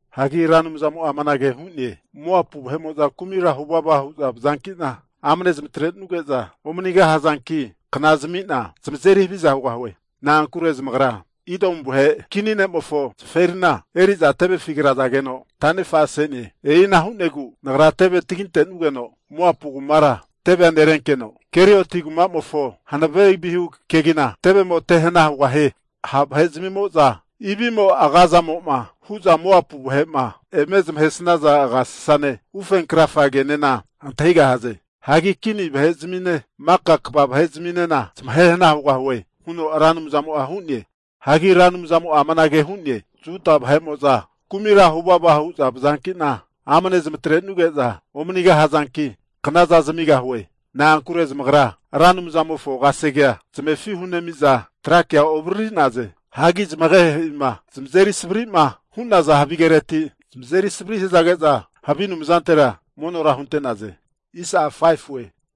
Hagi Ra Anumzamo'a amanage hu'ne, Moapu vahe'mo'za kumira huvava hu'za vazankina, amane zamatrenuge'za omanigahazanki, kna zamina zamazeri haviza hugahue. Na'ankure zamagra Idomu vahe kini ne'mofo zaferina eri'za tevefi krazageno tanefa'sene. E'ina hu'nagu Nagra teve taginte'nugeno Moapu kumara tevea nerenkeno, Kerioti kumamofo hanave vihu kegina tevemo te hana hugahie. Ha' vahezmimo'za ivimo agazamo'ma hu'za Moapu vahe'ma eme zamahesaza agasasane ufe krafa kenena antahigahaze. Hagi kini vahe'zamine maka kva vahezminena zamahe hana hugahue huno Ra Anumzamo'a hu'ne. Hagi Ra Anumzamo'a amanage hu'ne, Juda vahe'mo'za kumira huvava hu'za vazankina amane zamatrenuge'za omanigahazanki knaza zamigahue. Na'ankure zamagra Ra Anumzamo'na kasegea zamefi hunenamiza tra kea ovariri'naze. Hagi zamagehe'ima zamazeri savri'ma hu'naza havigereti zamazeri savri hazage'za, havi anumzantera monora hunte'naze.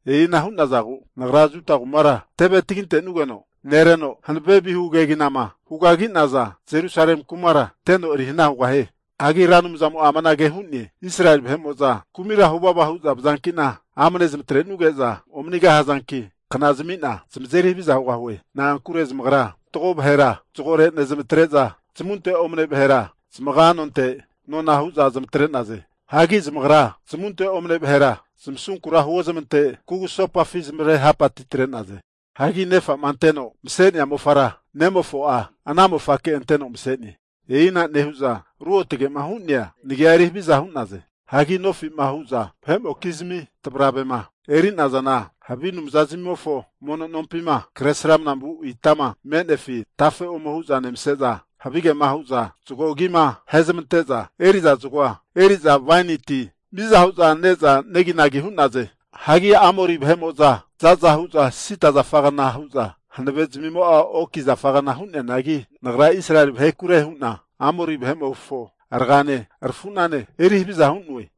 E'ina hu'nagu Nagra Juda kumara teve tagintenugeno nereno hanave vihu keginama hugagi'naza Jerusalemi kumara teno eri hana hugahie. Hagi Ra Anumzamo'a amanage hu'ne, Israeli vahe'mo'za kumira huvava hu'za vazanki'na amane zamatrenuge'za omanigahazanki kna zamina zamazeri haviza hugahue. Na'ankure zamagra fatgo vahera zagore nezamatre'za zamunte omane vahera zamaga nonte nona hu'za zamatre'naze. Hagi zamagra zamunte omane vahera zamasunkura huozmante kugusopafi zamare hapati atre'naze. Hagi nefa'ma anteno masea mofara nemofo'a ana mofake anteno masene. E'ina nehu'za ruotge'ma hu'nea Nagia eri haviza hu'naze. Hagi nofi'ma hu'za vahe'mokizmi tavravema eri'nazana havi anumzazmimofo mono nompima kresrama vu itama me'nefi tafe ome hu'za nemase'za, havigema hu'za zago agima ahezmante'za eri'za zagoa, eriza waini ti miza hu'za ne'za neginagi hu'naze. Hagi Amori vahe'mo'za za'za hu'za sida zafagana hazageno, hanave zamimo'a oki zafagna hu'neanagi, Nagra Israeli vahekure hu'na Amori vahe'mofo ragane rafu'nane eri haviza hu'noe.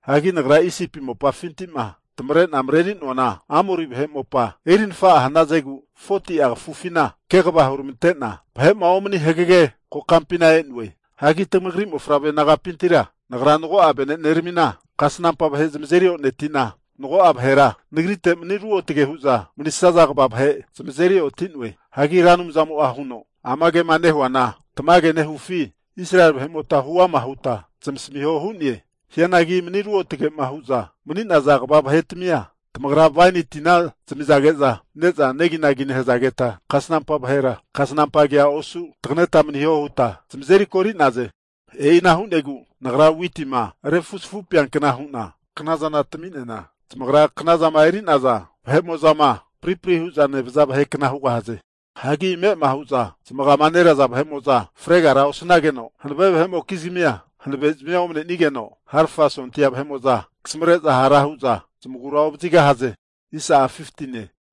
Hagi Nagra Isipi mopafinti'ma tamavre'na mareri'noana, Amori vahe mopa erinafa'a hanazegu 40'a kafufina kegava huramante'na vahe'ma omani hagege kokampina e'noe. Hagi tamagri mofavre nagapintira Nagra mago'a veneneramina kasnampa vahe zamazeri oneti'na, mago'a vahera Nagrite mani ruotge hu'za manisaza kva vahe (Nazirites) zamazeri oti'noe. Hagi Ra Anumzamo'a huno, Ama kema nehuana tamage nehufi Israeli vahe'mota hu'ama huta zamasamiho hu'ne. Hianagi mani ruotge'ma hu'za mani'naza kva vahetamia tamagra waini tina zamizage'za ne'za neginagi nehazageta, kasnampa vahera kasnampa kea osu taganeta maniho huta zamazeri kori'naze. E'ina hu'negu Nagra witima refuzafupeankna hu'na knazana tami'nena, tamagra knazama eri'naza vahe'mo'za'ma pripri hu'za nevaza vahekna hugahaze. Hagi ame'ama hu'za zamagama neraza vahe'mo'za fregara osanageno, hanave vahe'mokizmia hanavezamia omanenigeno, harafa sondia vahe'mo'za kasamare'za hara hu'za zamagura ovazigahaze.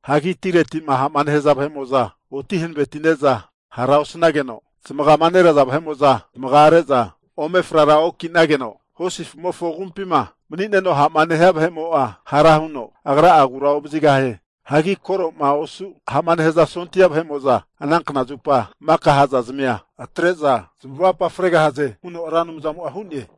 Hagi atireti'ma ha'ma nehaza vahe'mo'za oti hanavetine'za hara osanageno, zamagama neraza vahe'mo'za zamagare'za ome frara oki'nageno, hosi afumofo agumpima mani'neno ha'ma nehia vahe'mo'a hara huno agra'a agura ovazigahie. Hagi koro'ma osu ha'ma nehaza sondia vahe'mo'za ana knazupa maka ha'zazimia atre'za zamavapa fregahaze huno Ra Anumzamo'a hu'ne.